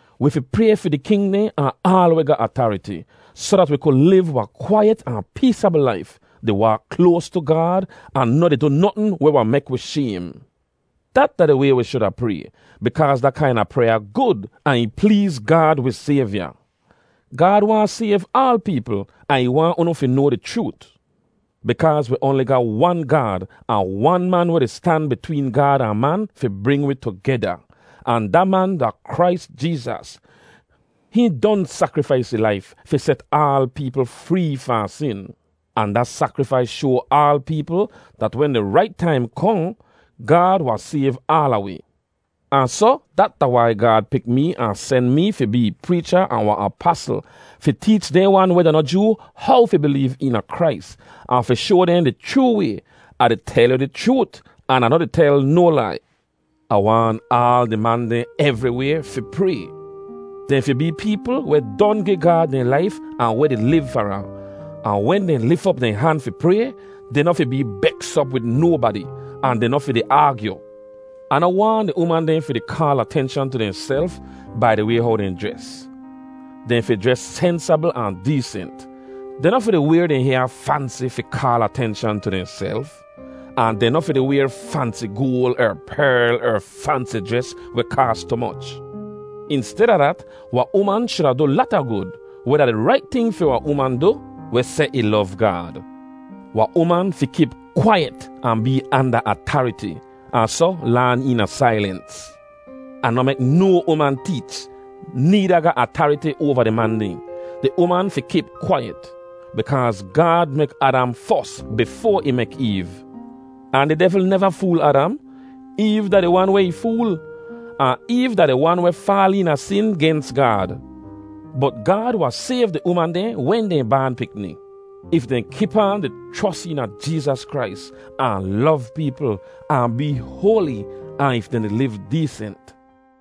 Wi fi pray fi di king dehn ahn aal weh ga atariti, soh dat wi ku liv wahn kwaiyet ahn peesabl laif, di waak kloas tu Gaad ahn noh di du notn weh wahn mek wi shaym. Dat da di way wi shuda pray, bikaaz da kaina pryaa gud, ahn ih pleez Gaad wi Sayvya. Gaad waahn sayv aal peepl ahn ih waahn unu fi noa di chroot. Bikaaz wi oanli ga wan Gaad ahn wan man weh di stan bitween Gaad ahn man fi bring wi tugeda, ahn da man da Krais Jeezas. Hihn don sakrifais ih laif fi set aal peepl free fahn sin. Ahn da sakrifais shoa aal peepl, dat wen di rait taim kohn, Gaad wahn sayv aala wi. Ahn soh dat da wai Gaad pik mee ahn sen mi fi bee ih preecha ahn wahn apasl, fi teech dehn wan weh da noh Joo how fi bileev eena Krais, ahn fi shoa dehn di chroo way. Ah di tel yu di chroot, an Ah noh di tel no lai. Ah waahn aal di man dehn evriway fi pray. Dehn fi bee peepl weh don gi Gaad dehn laif ahn weh di liv far ahn. Ahn wen dehn lif op dehn han fi pray, dehn noh fi bee beks op wid nobadi, ahn dehn noh fi di aagyu. Ah noh waahn di uman dehn fi di kaal atenshan tu dehnself bai di way how dehn jres. Dehn fi jres sensabl ahn deesent. Dehn noh fi di wayr dehn hyaa fansi fi kaal atenshan tu dehnself. Ahn dehn noh fi di wayr fansi goal er perl er fansi jres weh kaas tu moch. Insteda dat, wahn uman shuda du lata gud, weh da di rait ting fi wahn uman du weh seh ih lov Gaad. Wahn uman fi kip kwaiyet ahn bee anda atariti, ahn soh laan eena sailens. Ahn noh mek no uman teech, needa ga atariti oava di man dehn. Di uman fi kip kwaiyet. Bikaaz Gaad mek Adam fos, bifoa ih mek Eev. Ahn di devl neva fool Adam. Eev da di wan weh ih fool. Ahn Eev da di wan weh faal eena sin gens Gaad. Bot Gaad wahn sayv di uman dehn wen dehn baan pikni, if dehn kip aan di chros eena Jeezas Krais, ahn lov peepl, ahn bee hoali, ahn if dehn di liv deesent.